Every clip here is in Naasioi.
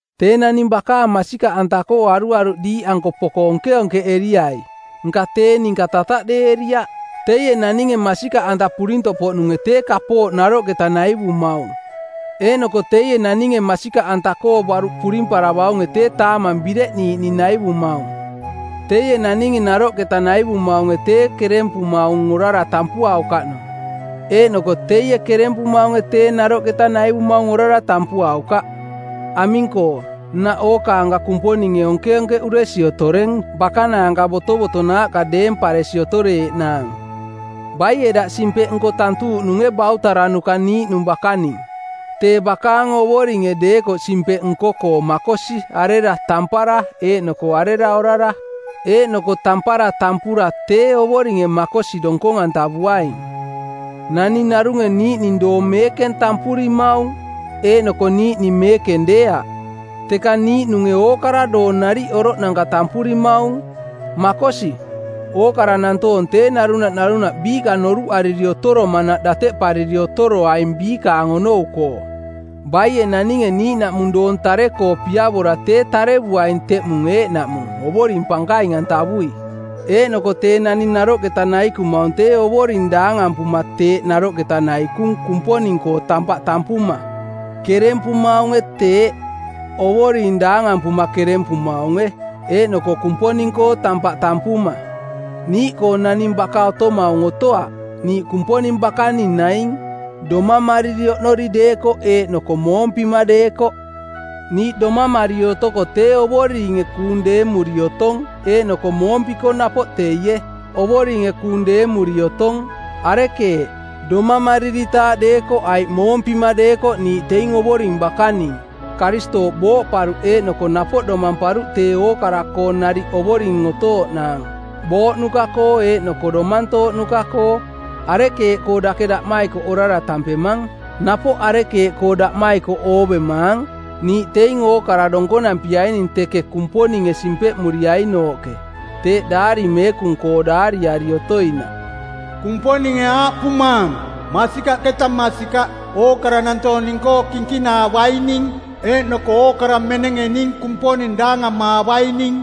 Tee naning bakaang masikaꞌanta-koo aruaruꞌ diiꞌanko poko onkeonkeꞌeriai, nka tee ninka tataꞌdeeriaꞌ. Teie naninge masikaꞌanta purintoꞌpoꞌnunge tee kapooꞌ naroꞌketa naivumaung eeꞌnoko teie naninge masikaꞌanta-koo baruꞌ purimparavaunge tee taamang bireꞌniiꞌning naivumaung. Teie naninge naroꞌketa naivumaunge tee kerempumaung orara tampuaukaꞌnung. Eeꞌnoko teie kerempumaunge tee naroꞌketa naivumaung orara tampuaukaꞌ. Aming-koo, nnaꞌ ookaanka Kumponinge onkeonkeꞌuresi otoreng bakanaanka botovotonaaꞌka deemparesi otoreeꞌnaang. Baie daꞌ simpeꞌnko˜ tantuuꞌnunge bautaranuka niiꞌnung bakaning? Tee bakaang Ovoringe deekoꞌ simpeꞌ nko-koo makosi arera tampara eeꞌnoko arera orara. Eeꞌnoko tampara tampura tee Ovoringe makosi donkong-antavuaing. Naning narunge niiꞌning doong meekeng tampurimaung eeꞌnoko niiꞌning meekeng deeaꞌ. Teka niiꞌnunge ookara doong nariꞌ oroꞌnanka tampurimaung. Makosi, ookara nantoong tee narunaꞌ narunaꞌ biiꞌka noruꞌariri otoromanaꞌ dateꞌpariri otoroaing biikaang onou-koo. Baie naninge niiꞌnaꞌmung doong tare-koo piavora tee tarevuaing teꞌmung eeꞌnaꞌmung Ovoring pankaing-antavui. Eeꞌnoko tee naning naroꞌketa naikumaung tee Ovoring daangampuma teeꞌ naroꞌketa naikung Kumponing-koo tampaꞌ tampuma. Kerempumaunge teeꞌ, Ovoring daangampuma kerempumaunge, eeꞌnoko Kumponing-koo tampaꞌ tampuma. Niiꞌkoo naning baka otomaung otoaꞌ, niiꞌ Kumponing bakaning naing, domamariri oꞌnori deekoꞌ eeꞌnoko moompima deekoꞌ. Niiꞌ domamariri otoko tee Ovoringe kuung deemuri otong eeꞌnoko moompiko napoꞌ teie, Ovoringe kuung deemuri otong. Arekeeꞌ, domamariritaaꞌ deekoꞌ aiꞌ moompima deekoꞌ niiꞌ teing Ovoring bakaning. Karistooꞌ booꞌparuꞌ eeꞌnoko napoꞌ domamparuꞌ tee ookara-koo nariꞌ Ovoring otooꞌnaang booꞌnuka-koo eeꞌnoko domantooꞌnuka-koo. Arekeeꞌkoo dake daꞌmaikoꞌ orara tampemang? Napoꞌ arekeeꞌkoo daꞌmaikoꞌ oovemaang? Niiꞌ teing ookara donkonampiaining teke Kumponinge simpeꞌmuriainooꞌke. Teeꞌ Daari Meekung-koo daariari otoinaꞌ, “Kumponinge aaꞌpumaang: Masikaꞌketa masikaꞌ, ookara nantoong ning-koo kinkinaavaining eeꞌnoko ookara menenge ning Kumponing daangamaavaining.”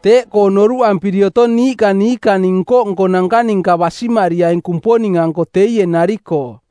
Teeꞌkoo noruꞌampiri otong niiꞌka niikaang nko-nkonanka ninka basimariaing Kumponing-anko teie nari-koo.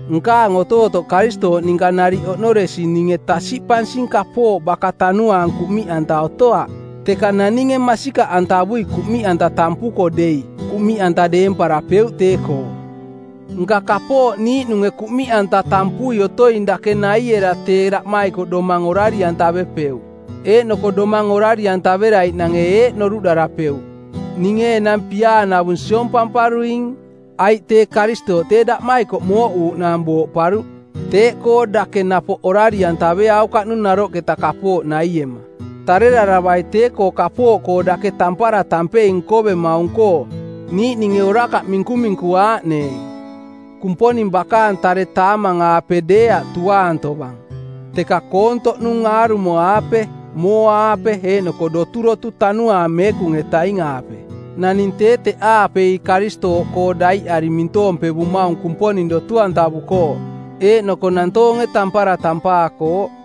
Nkaang otootoꞌ Karistooꞌ ninka nariꞌ oꞌnoresi ninge tasiꞌpansing kapooꞌ baka tanuaang kuꞌmiꞌanta otoaꞌ. Teka naninge masikaꞌantavui kuꞌmiꞌanta tampuko dei, kuꞌmiꞌanta deemparapeuꞌ tee-koo. Nka kapooꞌ niiꞌnunge kuꞌmiꞌanta tampui otoing dake naiera tee daꞌmaikoꞌ domang orari-antavepeuꞌ, eeꞌnoko domang orari-antaveraiꞌnange eeꞌ noruꞌdarapeuꞌ: Ninge enang piaanavung siompamparuing. Aiꞌ tee Karistooꞌ tee daꞌmaikoꞌ mooꞌuuꞌnaang booꞌparuꞌ, teeꞌkoo dake napoꞌ orari-antaveaukaꞌnung naroꞌketa kapooꞌ naiema. Tareraravai tee-koo kapooꞌkoo dake tampara tampei nkovemaung-koo niiꞌninge orakaꞌ minkuminku-aaꞌneeng. Kumponing bakaang tare taamang-aape deeaꞌ tuaang tovang, teka koontoꞌnung aarumo-aape, mooa-aape eeꞌnoko doturotu Tanuaang Meekung-etaing-aape. Naning tee teꞌaapei Karistooꞌkoo daiꞌari mintoompevumaung Kumponing dotu-antavukooꞌ eeꞌnoko nantoonge tampara tampaakooꞌ.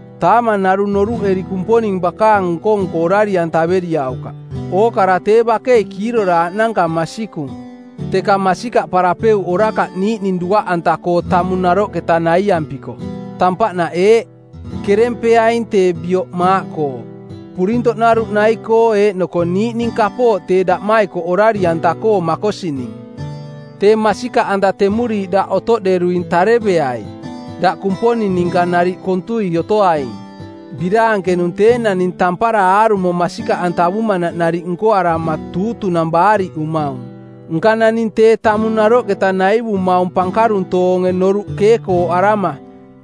Taamang narung noruꞌeri Kumponing bakaang nko-nko orari-antaveriaukaꞌ. Ookara tee bakei kiiroraaꞌnanka masikung, teka masikaꞌparapeuꞌ orakaꞌ niiꞌning duaꞌanta-koo tamung naroꞌketa naiampiko. Tampaꞌnaꞌ eeꞌ: Kerempeaing tee bioꞌ maaꞌkoo, purintoꞌnaruꞌ nai-koo eeꞌnoko niiꞌning kapooꞌ tee daꞌmaikoꞌ orari-anta-koo makosining. Tee masikaꞌanta temuriiꞌ daꞌ otoꞌderuing tareveai, daꞌ Kumponing ninka nariꞌ kontui otoaing. Biraankenung tee naning tampara aarumo masikaꞌantavumanaꞌ nariꞌ nkoarama tuutunang˜ baariꞌumaung. Nka naning tee tamung naroꞌketa naivumaung pankaruntoonge noruꞌ keekooꞌarama,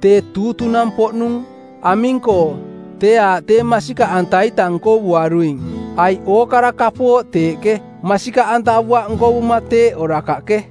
tee tuutunang-poꞌnung. Aming-koo? Tee aaꞌ tee masikaꞌanta-ita nkovuaruing. Aiꞌ ookara kapooꞌ teeꞌke, masikaꞌantavuaꞌ nkovuma teeꞌ orakaꞌke.